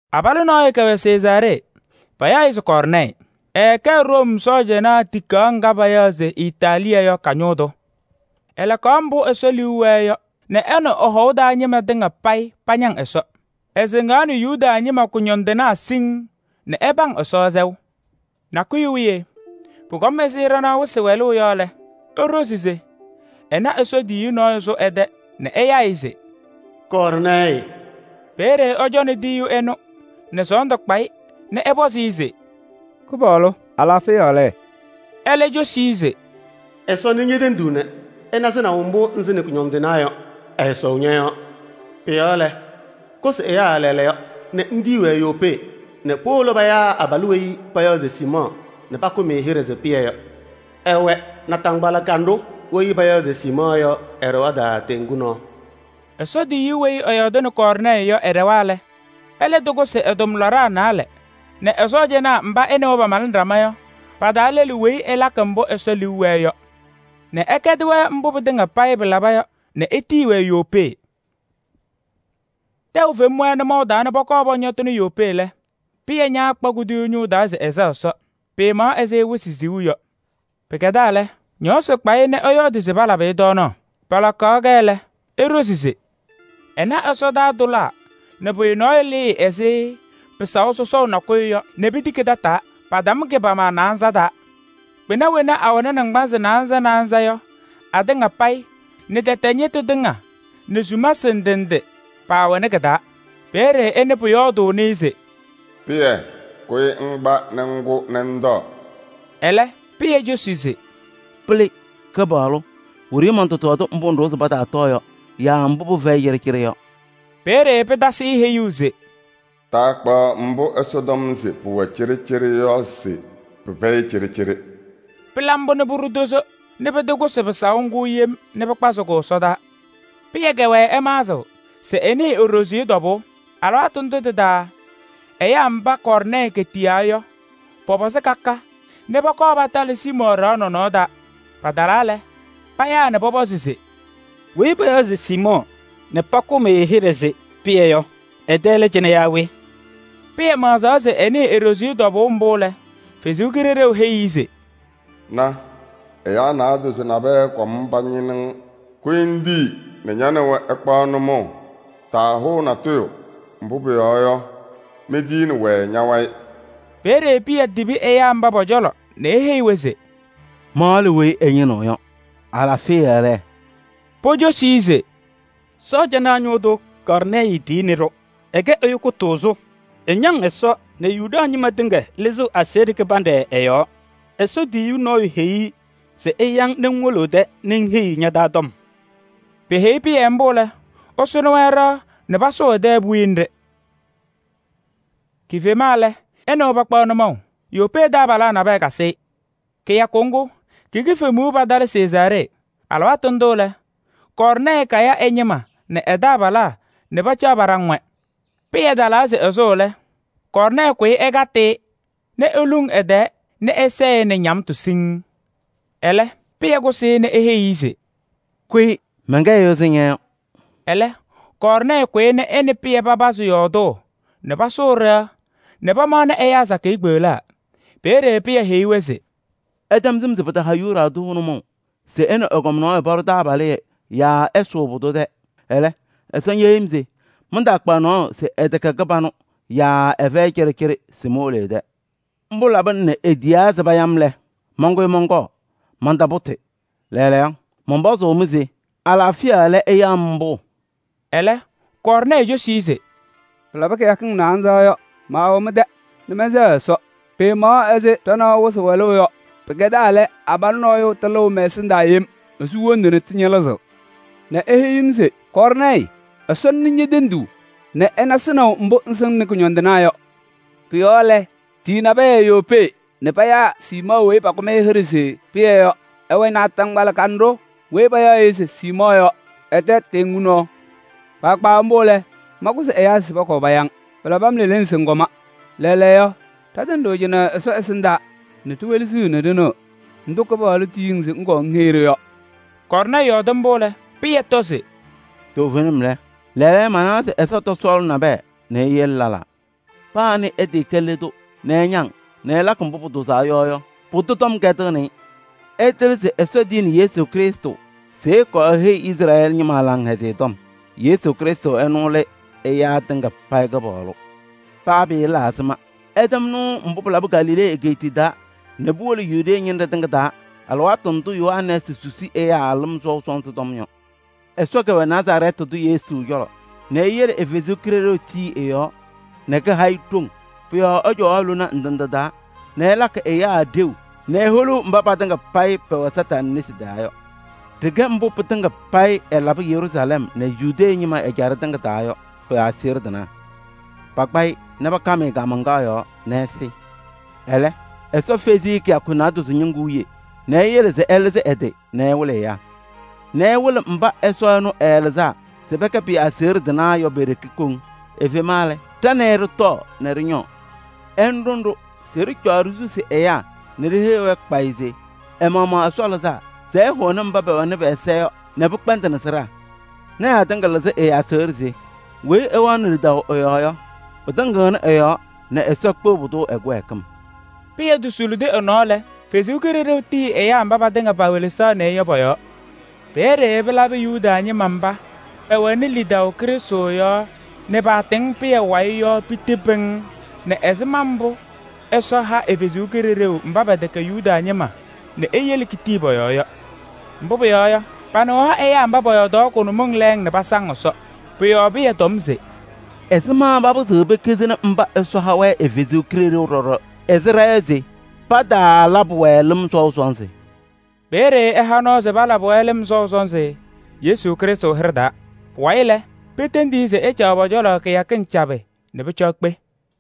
Abalʋ nɔɔyʋ kɛwɛ Sezaaree, payaɣ-ɩ se Kɔɔrnɛɛyɩ. Ɛɛkɛ Room sɔɔjanaa tikaɣ ŋga payaɣ se Itaaliyɛɛ yɔ ka-ñʋʋ tʋ. Ɛlakaɣ mbʋ Ɛsɔ liu wɛɛ yɔ nɛ ɛ nɛ ɛ-hɔʋ taa ñɩma tɩŋa payɩ pañaŋ Ɛsɔ. Ɛsɩŋaɣnɩ Yuda ñɩma kʋñɔndɩnaa siŋŋ nɛ ɛpaŋ Ɛsɔ sɛʋ. Nakʋyʋ wiye pʋkɔma ɛzɩ ɖanaɣ wɩsɩ wɛlʋʋ yɔ lɛ, eɖozi se ɛna Ɛsɔ tiyiyu nɔɔyʋ sʋ ɛ-tɛ nɛ ɛyaa-ɩ se: “Kɔɔrnɛɛyɩ!” Peeye ɛcɔnɩ tiyiyu ɛnʋ nɛ sɔɔndʋ kpa-ɩ nɛ ɛpɔzɩ-ɩ se: “Kɩpaɣlʋ! Alaafɩya lɛ?” Ɛlɛ cosi-i se: “Ɛsɔ nɩ ñe-tenduu nɛ ɛna sɩnaʋ mbʋ ŋsɩnɩ kʋñɔndɩnaa yɔ, ɛɛsɔʋ ñɔ-yɔɔ. Pʋ-yɔɔ lɛ, kʋsɩ ɛyaa lɛɛlɛɛyɔ nɛ ŋtiyi-wɛ Yopee nɛ powolo payaa abalʋ weyi payaɣ se Siimɔɔ nɛ pakʋm-ɩ hɩɖɛ se Pɩyɛ yɔ. Ɛwɛ naataŋgbala kanɖʋ weyi payaɣ se Siimɔɔ yɔ ɛ-ɖɩɣa taa teŋgu nɔɔ.” Ɛsɔ tiyiyu weyi ɛyɔɔdɩnɩ Kɔɔrnɛɛyɩ yɔ, ɛɖɛwa lɛ, ɛlɛ tɩkʋsɩ ɛ-tʋmlaɖaa naalɛ nɛ ɛ-sɔɔjanaa mba ɛ nɛ wɛ pamalɩnɩ ɖama yɔ pa-taa lɛlʋ weyi ɛlakɩ mbʋ Ɛsɔ liu wɛɛ yɔ nɛ ɛkɛdɩ-wɛ mbʋ pɩtɩŋa payɩ pɩlaba yɔ nɛ etiyi-wɛ Yopee. Tɛʋ fem-wɛ nʋmɔʋ taa nɛ pɔkɔɔ pɔñɔtɩnɩ Yopee lɛ, Pɩyɛ ñaakpa kuduyuu ñʋʋ taa se ɛsɛɣ Ɛsɔ, pɩɩmaɣ ɛzɩ wɩsɩ siɣu yɔ. Pɩkɛdaa lɛ, ñɔɔsɩ kpa-ɩ nɛ ɛyɔɔdɩ se palabɩ-ɩ tɔɔnaɣ. Palakaɣ-kɛ lɛ, eɖozi se ɛna ɛsɔdaa tʋlaa nɛ pʋyʋ nɔɔyʋ lɩɩ ɛzɩ pɩsaʋ sɔsɔʋ nakʋyʋ yɔ nɛ pitiki tataa. Patam kɩ-pama naanza taa. Kpɩna wena awɛnɩ naŋgbanzɩ naanza naanza yɔ atɩŋa payɩ nɛ tɛtɛ ñɩtʋ tɩŋa nɛ sumasɩ ndɩ ndɩ paawɛnɩ kɩ-taa. Peeye ɛnɩ pʋyɔɔdʋʋnɩ-ɩ se: “Pɩyɛ! Kʋyɩ ŋkpa nɛ ŋkʋ nɛ ŋtɔɔ!” Ɛlɛ, Pɩyɛ cosi se: “Pɩlɩ! Kɩpaɣlʋ, wiɖiyi mɔntɔtɔɔdɩ mbʋ ŋɖʋwa se pataatɔɔ yɔ yaa mbʋ pɩfɛyɩ cɩɖɩcɩɖɩ yɔ.” Peeye pɩtasɩ-ɩ heyuu se: “Taakpaɣ mbʋ Ɛsɔ tɔm se pʋwɛ cɩɖɩcɩɖɩ yɔ se pɩfɛyɩ cɩɖɩcɩɖɩ.” Pɩla mbʋ nɛ pʋɖʋ tozo nɛ pɩtɩkʋsɩ pɩsaʋ ŋgʋ yem nɛ pɩkpazɩ-kʋ ɛsɔdaa. Pɩyɛ kɛwɛɛ ɛmaɣzɩɣ se ɛnɩɩ e-ɖoziye tɔbʋʋ. Alɩwaatʋ ndʋ tɩ-taa ɛyaa mba Kɔɔrnɛɛyɩ ketiyaa yɔ pɔpɔzɩ ka ka nɛ pɔkɔɔ patalɩ Siimɔɔ ɖɩɣa nɔnɔɔ taa. Patalaa lɛ, payaa nɛ pɔpɔzɩ se: “Weyi payaɣ se Siimɔɔ nɛ pakʋm-ɩ hɩɖɛ se Pɩyɛ yɔ, ɛ-tɛ lɛ cɩnɛ yaa we?” Pɩyɛ maɣzaɣ se ɛnɩɩ e-ɖoziye tɔbʋʋ mbʋ lɛ, Ɛsɔ Kalɩzaɣ heyi-i se: “Na! Ɛyaa naadozo nabɛyɛ kɔm pañɩnɩɣ-ŋ. Kʋyɩ ŋtii nɛ ña nɛ wɛ ɩkpaɣ nʋmɔʋ, taahʋʋ natʋyʋ. Mbʋ pʋyɔɔ yɔ, mentiyini-wɛ ña-wayɩ.” Peeye Pɩyɛ tibi ɛyaa mba pɔ-cɔlɔ nɛ eheyi-wɛ se: “Ma lɛ weyi ɩñɩnɩɣ yɔ. Alaafɩya lɛ?” Pocosi-i se: “Sɔɔjanaa ñʋʋ tʋ Kɔɔrnɛɛyɩ tiyini-ɖʋ. Ɛkɛ ɛyʋ kʋtʋʋzʋ, ɛñaŋ Ɛsɔ nɛ Yuda ñɩma tɩŋa lɩzɩɣ aseɣɖe kɩbanɖɛ ɛ-yɔɔ. Ɛsɔ tiyiyu nɔɔyʋ heyi-i se ɛya-ŋ nɛ ŋwolo ɛ-tɛ nɛ ŋheyi-i ña-taa tɔm.” Peheyi Pɩyɛ mbʋ lɛ, ɛsʋnɩ-wɛ ɖɩɣa nɛ pasʋʋ ɛ-tɛ puwiye nɖɩ. Kifema lɛ, ɛ nɛ wɛ pakpaɣ nʋmɔʋ. Yopee taabalaa nabɛyɛ kasɩ-ɩ. Kɩyakʋ ŋgʋ ki-kifemuu patalɩ Sezaaree. Alɩwaatʋ ndʋ lɛ, Kɔɔrnɛɛyɩ kaya ɛ-ñɩma nɛ e-cewaa nɛ pacaɣ paɖaŋ-wɛ. Pɩyɛ talaa se ɛsʋʋ lɛ, Kɔɔrnɛɛyɩ kʋyɩ ɛkatɩ-ɩ nɛ eluŋ ɛ-tɛɛ nɛ ɛsɛɛ-ɩ nɛ ñamtʋ siŋŋ. Ɛlɛ Pɩyɛ kʋsɩ-ɩ nɛ eheyi-i se: “Kʋyɩ, mɛnkɛ ɛyʋ ɛzɩ ña yɔ.” Ɛlɛ Kɔɔrnɛɛyɩ kʋyɩ nɛ ɛ nɛ Pɩyɛ papazɩ yɔɔdʋʋ nɛ pasʋʋ ɖɩɣa nɛ pamaɣnɩ ɛyaa sakɩyɛ kpeɣlaa. Peeye Pɩyɛ heyi-wɛ se: “Ɩtɛm sɩm se pɩtaha Yuda tʋ nʋmɔʋ se ɛ nɛ ɛgɔm nɔɔyʋ paɖʋ taabalɩyɛ yaa ɛsʋʋ pʋdʋ tɛ. Ɛlɛ, Ɛsɔ ñeheyi-m se mantaakpaɣ nɔɔyʋ se ɛtɛkɛ kɩbanʋ yaa ɛfɛyɩ cɩɖɩcɩɖɩ se powolo ɛ-tɛ. Mbʋ labɩna nɛ itiyaa se paya-m lɛ, mankʋyɩ mɔnkɔɔ, mɔntɔcɔɔ ñʋʋ. Lɛɛlɛɛyɔ, mɔnpɔzʋʋ-mɩ se alaafɩya lɛ ɩya-m mbʋ?” Ɛlɛ Kɔɔrnɛɛyɩ cosi-i se: “Pɩlabɩ kɩyakɩŋ naanza yɔ, maawɛ mɛn-tɛ nɛ mɛnsɛɣ Ɛsɔ, pɩɩmaɣ ɛzɩ ɖanaɣ wɩsɩ wɛlʋʋ yɔ. Pɩkɛdaa lɛ, abalʋ nɔɔyʋ tɩlɩʋ mɛ-ɛsɩndaa yem. Esu wondu nɛ tɩñɩlɩzɩɣ nɛ eheyi-m se: ‘Kɔɔrnɛɛyɩ! Ɛsɔ nɩ ñe-tenduu nɛ ɛna sɩnaʋ mbʋ ŋsɩŋnɩ kʋñɔndɩnaa yɔ. Pʋ-yɔɔ lɛ, tiyi nabɛyɛ Yopee nɛ payaa Siimɔɔ weyi pakʋm-ɩ hɩɖɛ se Pɩyɛ yɔ. Ɛwɛ naataŋgbala kanɖʋ weyi payaɣ-ɩ se Siimɔɔ yɔ ɛ-tɛ teŋgu nɔɔ.’ Kpaagbaa mbʋ lɛ, mankʋsɩ ɛyaa se pɔkɔɔ paya-ŋ. Pɩlabɩ-m leleŋ se ŋkɔma. Lɛɛlɛɛyɔ, ɖatɩŋa ɖɩwɛ cɩnɛ Ɛsɔ ɛsɩndaa nɛ ɖiwelesiɣ se ɖɩnɩɩ ndʋ ɛnʋ Kɩpaɣlʋ etiyi-ŋ se ŋkɔɔ ŋheyi-ɖʋ yɔ.” Kɔɔrnɛɛyɩ yɔɔdɩ mbʋ lɛ, Pɩyɛ tɔ se: “Toovenim lɛ, lɛɛlɛɛyɔ manawa se Ɛsɔ tɔsɔɔlɩ nabɛyɛ nɛ eyele lɛlaa: paa weyi ɛkɛ le tʋ nɛ ɛñaŋ-ɩ nɛ ɛlakɩ mbʋ pʋtʋʋzaa yɔ yɔ, pʋdʋ tɔm kɛdɩɣnɩ-ɩ. Ɩtɩlɩ se Ɛsɔ tiyini Yesu Krɩstʋ se ɛkɔɔ eheyi Izrɛɛlɩ ñɩma Laŋhɛzɩyɛ Tɔm. Yesu Krɩstʋ ɛnʋ lɛ ɛyaa tɩŋa payɩ Kɩpaɣlʋ. Paa pɩɩla ɛzɩma, ɩtɛm nɩʋ mbʋ pɩlabɩ Galilee egeetiye taa nɛ puwolo Yudee ñɩnɖɛ tɩŋa taa alɩwaatʋ ndʋ Yohanɛɛsɩ susi ɛyaa lɩm sɔʋ sɔnzɩ tɔm yɔ. Ɛsɔ kɛwɛ Nazarɛɛtɩ tʋ Yesu cɔlɔ nɛ eyele ɛ-Kalɩzaɣ tii ɛ-yɔɔ nɛ kaha-ɩ ɖoŋ. Pʋ-yɔɔ ɛcɔwaɣ lona ndɩ ndɩ taa nɛ ɛlakɩ ɛyaa ɖeu nɛ eholuu mba patɩŋa payɩ pɛwɛ Kañadʋ Satanɩ nesi taa yɔ. Ɖɩkɛ mbʋ pɩtɩŋa payɩ ɛlabɩ Yeruusalɛm nɛ Yuda ñɩma ɛjaɖɛ tɩŋa taa yɔ pɩ-aseɣɖe tɩnaa. Pakpa-ɩ nɛ pakam-ɩ kaamaŋkaɣ yɔɔ nɛ ɛsɩ. Ɛlɛ, Ɛsɔ fezi-i kɩyakɩŋ naadozo wiye nɛ eyele se ɛlɩzɩ ɛ-tɩ nɛ ɛwɩlɩ mba Ɛsɔ ɛnʋ ɛɛlɩzaa se pɛkɛ pɩ-aseɣɖe tɩnaa yɔ pe-ɖeke koŋ. Efema lɛ, ɖa nɛ ɩ ɖɩtɔɔ nɛ ɖɩñɔɔ. Ɛnʋ ɖʋnɩ-ɖʋ se ɖɩcɔɔ ɖisusi ɛyaa nɛ ɖiheyi-wɛ kpayɩ se ɛ-maɣmaɣ Ɛsɔ lɩzaa se ɛhʋnɩ ɛza tɩnaa nɛ pɩkpɛndɩnɩ sɩɖaa. Lɔɔyɩsɩ tɩnaa tɩŋa lɩzɩ ɛ-aseɣɖe se: weyi ɛwɛɣnɩ lidaʋ ɛ-yɔɔ yɔ, pɩtɩŋɩɣnɩ ɛ-yɔɔ nɛ Ɛsɔ kpeɣ pʋdʋ ɛ-kɩwɛɛkɩm.” Pɩyɛ tosulidi ɛ-nɔɔ lɛ, Ɛsɔ Kalɩzaɣ tii ɛyaa mba patɩŋa pewelesaɣnɩ-ɩ yɔ pɔ-yɔɔ. Peeye pɩlabɩ Yuda ñɩma mba pɛwɛnɩ lidaʋ Krɩstʋ yɔɔ nɛ paasɩ Pɩyɛ yɔ piti pɩŋŋ nɛ ɛzɩma mbʋ Ɛsɔ ha ɛ-Kalɩzaɣ mba pɛtɛkɛ Yuda ñɩma nɛ eyele ketii pɔ-yɔɔ yɔ. Mbʋ pʋyɔɔ yɔ, panɩɣaɣ ɛyaa mba pɔyɔɔdaɣ kʋnʋmɩŋ lɛɛŋ nɛ pasaŋ Ɛsɔ. Pʋ-yɔɔ Pɩyɛ tɔm se: “Ɛzɩma papɩzɩɣ pekizini mba Ɛsɔ ha-wɛ ɛ-Kalɩzaɣ ɖɔɖɔ ɛzɩ ɖa yɔ se pataalabɩ-wɛ lɩm sɔʋ sɔnzɩ?” Peeye ɛha nɔɔ se palabɩ-wɛ lɩm sɔʋ sɔnzɩ Yesu Krɩstʋ hɩɖɛ taa. Pʋwayɩ lɛ, petendi-i se ɛcaɣ pɔ-cɔlɔ kɩyakɩŋ cabɩ nɛ pʋcɔ ekpe.